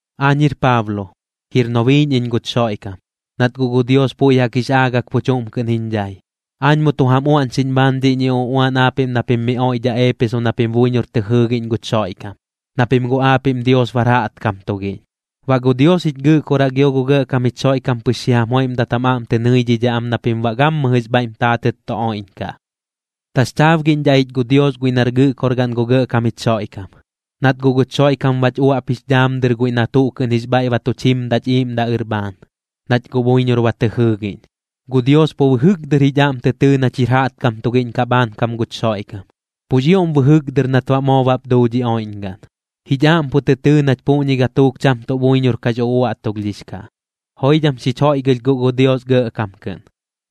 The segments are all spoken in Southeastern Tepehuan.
Aañ jir Paablo, jir nobiiꞌñ iñ guch Xoiꞌkam, nat guꞌ gu Dios puiꞌ jaꞌk jix aagak pu chuꞌm kɨꞌn jiñ dhai. Aañ mu tu jam uaꞌñxiꞌñ bhaan dhiꞌñi uꞌuan aapiꞌm na pim miꞌ oiꞌdhaꞌ Eepeso na pim buiñor tɨ jɨɨgiꞌñ guch Xoiꞌkam, na pim guꞌ aapiꞌm Dios bar jaꞌtkam tugiꞌñ. Baꞌ gu Dios jich Gɨꞌkoraꞌ gio gu Gɇꞌkam jich Xoiꞌkam pɨx xi jam joiꞌmdat jam aꞌm tɨ nɨidhidhaꞌ am na pim baꞌ gammɨjɨx bhaiꞌm taatɨt tu oiꞌñkaꞌ. Taxchaabgiꞌñdhaꞌ ich gu Dios guiꞌ nar Gɨꞌkorgaꞌn gu Gɇꞌkam jich Xoiꞌkam, nat guꞌ guch Xoiꞌkam bach uaꞌp jix dhaam dɨr guiꞌ na tuꞌ kɨꞌn jix bhaiꞌ ba tuch jimdaꞌch iꞌiiꞌmdaꞌ ɨr bhaan, nach guꞌ buiñor ba tɨ jɨɨgiꞌñ. Gu Dios pu bɨjɨk dɨr jich aꞌm tɨ tɨɨ nach jir jaꞌtkam tugiꞌñ kaꞌ bhaankam guch Xoiꞌkam, pux ioꞌm bɨjɨk dɨr nat baꞌ moo bap duu dhi oiꞌñgaꞌn. Jich aꞌm pu tɨ tɨɨ nach puꞌñi gatuuk cham tuꞌ buiñor kax uꞌuaꞌtulhdhix kaꞌ. Joidham xich joiꞌgɨlh guꞌ gu Dios gɇꞌkam kɨꞌn,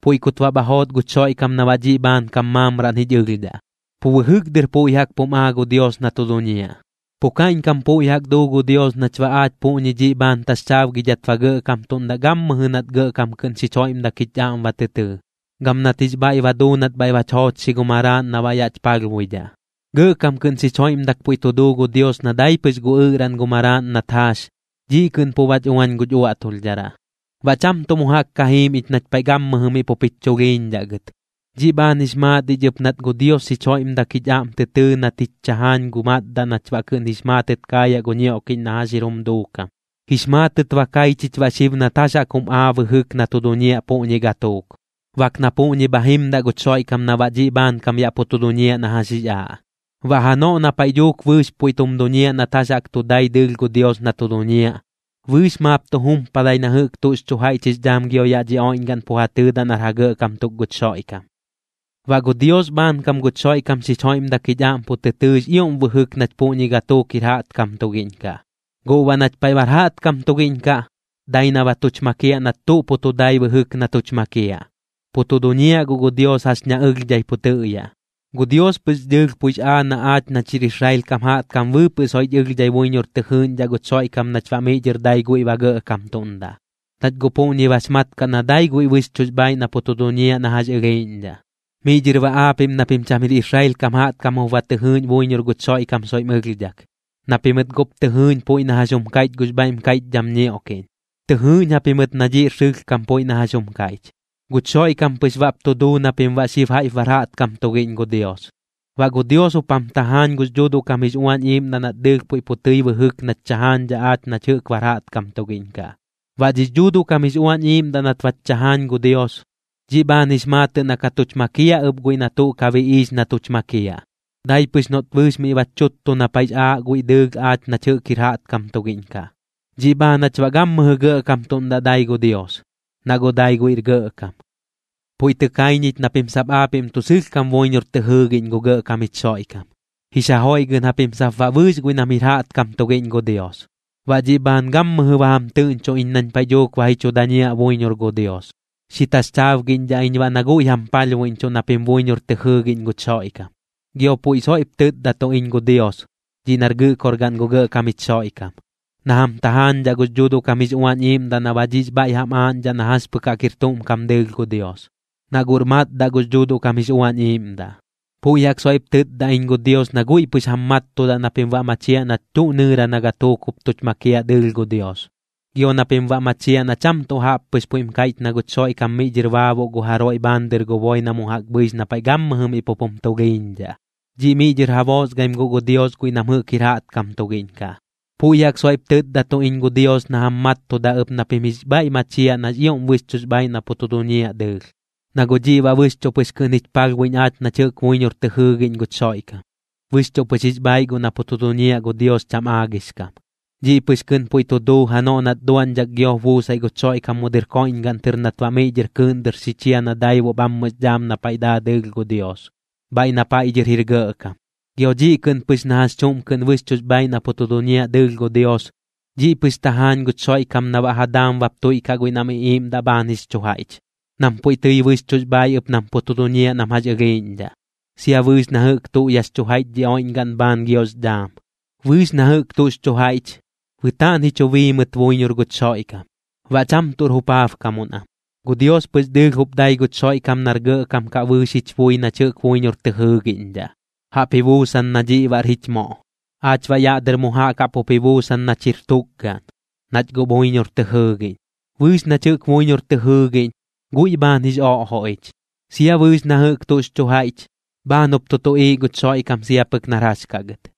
puiꞌ kut baꞌ bha joot guch Xoiꞌkam na baꞌ dhiꞌ bhaankam maamraꞌn jich ɨlhdhaꞌ, pu bɨjɨk dɨr puiꞌ jaꞌk pum aa gu Dios na tu duñiaꞌ. Pu kaiꞌñkam puiꞌ jaꞌk duu gu Dios nach baꞌ aach puꞌñi dhiꞌ bhaan taxchaabgidhat ba gɇꞌkamtuꞌndaꞌ gammɨjɨ nat gɇꞌkam kɨꞌn xich joiꞌmdak jich aꞌm ba tɨ tɨɨ, gam nat jix bhaiꞌ ba duu nat bhaiꞌ bach joochxi gu Maraaꞌn na baꞌ yaꞌch palhbuidhaꞌ. Gɇꞌkam kɨꞌn xich joiꞌmdak puiꞌ tu duu gu Dios na dai pɨx gu ɨꞌraꞌn gu Maraaꞌn nat jaax, dhiꞌ kɨꞌn pu bach uañ guch uaꞌtulhdharaꞌ, baꞌ cham tuꞌ mu jaꞌk ka jiim ich nach paiꞌ gammɨjɨ miꞌ pup jich chulhiiñdhaꞌ gɨt. Dhiꞌ bhaan jix maat ich ɨp nat gu Dios xich joiꞌmdak jich aꞌm tɨ tɨɨ nat jich chajaañ gu matdaꞌ nach baꞌ kɨꞌn jix maatɨt kaayaꞌ gu ñioꞌkiꞌñ na jax jir jum duukam. Jix maatɨt ba kai chich baꞌ xib nat jax jaꞌk jum aa bɨjɨk na tu duñiaꞌ puꞌñi gatuuk, bak na puꞌñi bha jimdaꞌ guch Xoiꞌkam na baꞌ dhiꞌ bhaankam yaꞌ pu tu duñiaꞌ na jax jix aaꞌ. Baꞌ janoꞌ na paiꞌ dhuuk bɨɨx puiꞌ tum duñiaꞌ nat jax jaꞌk tu dai dɨɨlh gu Dios na tu duñiaꞌ, bɨɨx maap tu jumpadai na jɨꞌk tuꞌx chu jaiꞌch jix dhaam gio yaꞌ dhi oiꞌñgaꞌn pu ja tɨɨdaꞌ nar ja gɇꞌkam tuk guch Xoiꞌkam. Baꞌ gu Dios bhaankam guch Xoiꞌkam xich joiꞌmdak jich aꞌm pu tɨ tɨɨx ioꞌm bɨjɨk nach puꞌñi gatuuk jir jaꞌtkam tugiꞌñ kaꞌ. Guꞌ baꞌ nach paiꞌ bar jaꞌtkam tugiꞌñ kaꞌ, dai na ba tuch makiaꞌ nat tuꞌ pu tu dai bɨjɨk na tuch makiaꞌ. Pu tu duñiaꞌ guꞌ gu Dios jax ña ɨlhdhai pu tɨꞌyaꞌ. Gu Dios pɨx dɨɨlh puiꞌx aa na aach nach jir Israel kam jaꞌtkam bɨɨpɨꞌ soiꞌch ɨlhdhai buiñor tɨ jɨɨꞌñdhaꞌ guch Xoiꞌkam nach baꞌ miꞌ dhɨr dai guiꞌ ba gɇꞌkamtuꞌndaꞌ, nach guꞌ puꞌñi bax mat kaꞌ na dai guiꞌ bɨxchuꞌx bhaaiꞌ na pu tu duñiaꞌ na jax ɨlhiiꞌñdhaꞌ. Miꞌ dhɨr baꞌ aapiꞌm na pim cham jir Israel kam jaꞌtkam jup ba tɨ jɨɨꞌñ buiñor guch Xoiꞌkam soiꞌm ɨlhdhak, na pimɨt guꞌp tɨ jɨɨꞌñ puiꞌ na jax jum kaiꞌch gux bhaiꞌm kaiꞌchdham ñioꞌkiꞌñ. Tɨ jɨɨꞌñ japimɨt na dhiꞌr sɨlhkam puiꞌ na jax jum kaiꞌch, guch Xoiꞌkam pɨx baꞌp tu duu na pim baꞌ xib jaiꞌp bar jaꞌtkam tugiꞌñ gu Dios. Baꞌ gu Dios jup jam tajaañ gux Dhuuduꞌ kam jix Uañ Iiꞌmdaꞌ nat dɨɨlh puiꞌ pu tɨi bɨjɨk nach chajaañdhaꞌ aach nach jɨꞌk bar jaꞌtkam tugiꞌñ kaꞌ. Baꞌ dhix Dhuuduꞌ kam jix Uañ Iiꞌmdaꞌ nat bach chajaañ gu Dios, dhiꞌ bhaan jix maatɨꞌ na ka tuch makiaꞌ ɨp guiꞌ na tuꞌ ka biꞌiix na tuch makiaꞌ, dai pɨx noꞌt bɨɨx miꞌ bach chuttu na paiꞌx aaꞌ guiꞌ dɨɨlh aach nach jɨꞌk jir jaꞌtkam tugiꞌñ kaꞌ. Dhiꞌ bhaan jach baꞌ gammɨjɨ gɇꞌkamtuꞌndaꞌ dai gu Dios, na guꞌ dai guiꞌr Gɇꞌkam. Puiꞌ tɨ kai ñich na pim sap aapiꞌm tuꞌ sɨlhkam buiñor tɨ jɨɨgiꞌñ gu Gɇꞌkam jich Xoiꞌkam, jix ja joiꞌgɨꞌn japim sap baꞌ bɨɨx guiꞌ nam jir jaꞌtkam tugiꞌñ gu Dios. Baꞌ dhiꞌ bhaan gammɨjɨ ba jam tɨꞌñchoꞌ iñ nañ paiꞌ dhuuk ba ji chu dañiaꞌ buiñor gu Dios, xi taxchaabgiꞌñdhaꞌ iñ baꞌ na guiꞌ jam palhbuiꞌñchuꞌ na pim buiñor tɨ jɨɨgiꞌñ guch Xoiꞌkam. Gio puiꞌ soiꞌp tɨtdatuꞌ iñ gu Dios, dhiꞌ nar Gɨꞌkorgaꞌn gu Gɇꞌkam jich Xoiꞌkam, na jam tajaañdhaꞌ gux Dhuuduꞌ kam jix Uañ Iiꞌmdaꞌ na baꞌ dhiꞌx bhaiꞌ jam aaꞌñdhaꞌ na jax pɨk jaꞌk jir tuꞌm kam dɨɨlh gu Dios, na guꞌr matdaꞌ gux Dhuuduꞌ kam jix Uañ Iiꞌmdaꞌ. Puiꞌ jaꞌk soiꞌp tɨtda iñ gu Dios na guiꞌ pɨx jam mattudaꞌ na pim baꞌ machiaꞌ nach tuꞌ nɨɨra na gatuuk jup tuch makiaꞌ dɨɨlh gu Dios, gio na pim baꞌ machiaꞌ na cham tuꞌ jaꞌp pɨx puiꞌm kaiꞌch na guch Xoiꞌkam miꞌ dhɨr baabuꞌ gu jaroiꞌ bhaan dɨr gu boi na mu jaꞌk bhɨix na paiꞌ gammɨjɨ miꞌ pup jum tulhiiñdhaꞌ, dhiꞌ miꞌ dhɨr ja boosgaim guꞌ gu Dios guiꞌ nam jɨꞌk jir jaꞌtkam tugiꞌñ kaꞌ. Puiꞌ jaꞌk soiꞌp tɨtdatuꞌ iñ gu Dios na jam mattudaꞌ ɨp na pim jix bhaiꞌ machiaꞌ nax ioꞌm bɨxchuꞌx bhaaiꞌ na pu tu duñiaꞌ dɨɨlh, na guꞌ dhiꞌ baꞌ bɨxchuꞌ pɨx kɨꞌn jich palhbuiꞌñ aach nach jɨꞌk buiñor tɨ jɨɨgiꞌñ guch Xoiꞌkam. Bɨxchuꞌ pɨx jix bhaaiꞌ guꞌ na pu tu duñiaꞌ gu Dios cham aagix kam. Dhiꞌ pɨx kɨꞌn puiꞌ tu duu janoꞌ nat duaꞌñdhak giop buusaiꞌ guch Xoiꞌkam mu dɨr koiꞌñgaꞌn tɨr nat baꞌ miꞌ dhɨr kɨɨꞌn dɨr xi chia na daibuꞌ bhammɨx dhaam na paiꞌ daa dɨɨlh gu Dios, bhaiꞌ na paiꞌ dhɨr jir Gɇꞌkam. Gio dhiꞌ kɨꞌn pɨx na jax chuꞌm kɨꞌn bɨxchuꞌx bhaaiꞌ na pu tu duñiaꞌ dɨɨlh gu Dios, dhiꞌ pɨx tajaañ guch Xoiꞌkam na baꞌ ja daam bap tuiꞌkaꞌ guiꞌ nam iꞌiiꞌmdaꞌ bhaan jix chu jaiꞌch, nam puiꞌ tɨi bɨxchuꞌx bhaaiꞌ ɨp nam pu tu duñiaꞌ nam jax ɨlhiiꞌñdhaꞌ, sia bɨɨx na jɨꞌk tuꞌ yaꞌx chu jaiꞌch dhi oiꞌñgaꞌn bhaan giox dhaam. Bɨɨx na jɨꞌk tuꞌx chu jaiꞌch, bɨtaaꞌn ji chu bii mɨt buiñor guch Xoiꞌkam, baꞌ cham tuꞌr jupaabkamuꞌn am. Gu Dios pɨx dɨɨlh jup dai guch Xoiꞌkam nar Gɇꞌkam kaꞌ bɨɨx jich bui nach jɨꞌk buiñor tɨ jɨɨgiꞌñdhaꞌ, jaꞌp ji buusan na dhiꞌ baꞌr jich moꞌ. Aach baꞌ yaꞌ dɨr mu jaꞌk jaꞌp jup ji buusan nach jir tukgaꞌn, nach guꞌ buiñor tɨ jɨɨgiꞌñ. Bɨɨx nach jɨꞌk buiñor tɨ jɨɨgiꞌñ, guiꞌ bhaan jix oꞌjoꞌ ich. Sia bɨɨx na jɨꞌk tuꞌx chu jaiꞌch, bhaan jup tu tuꞌiiꞌ guch Xoiꞌkam sia pɨk nar jax kaꞌ gɨt.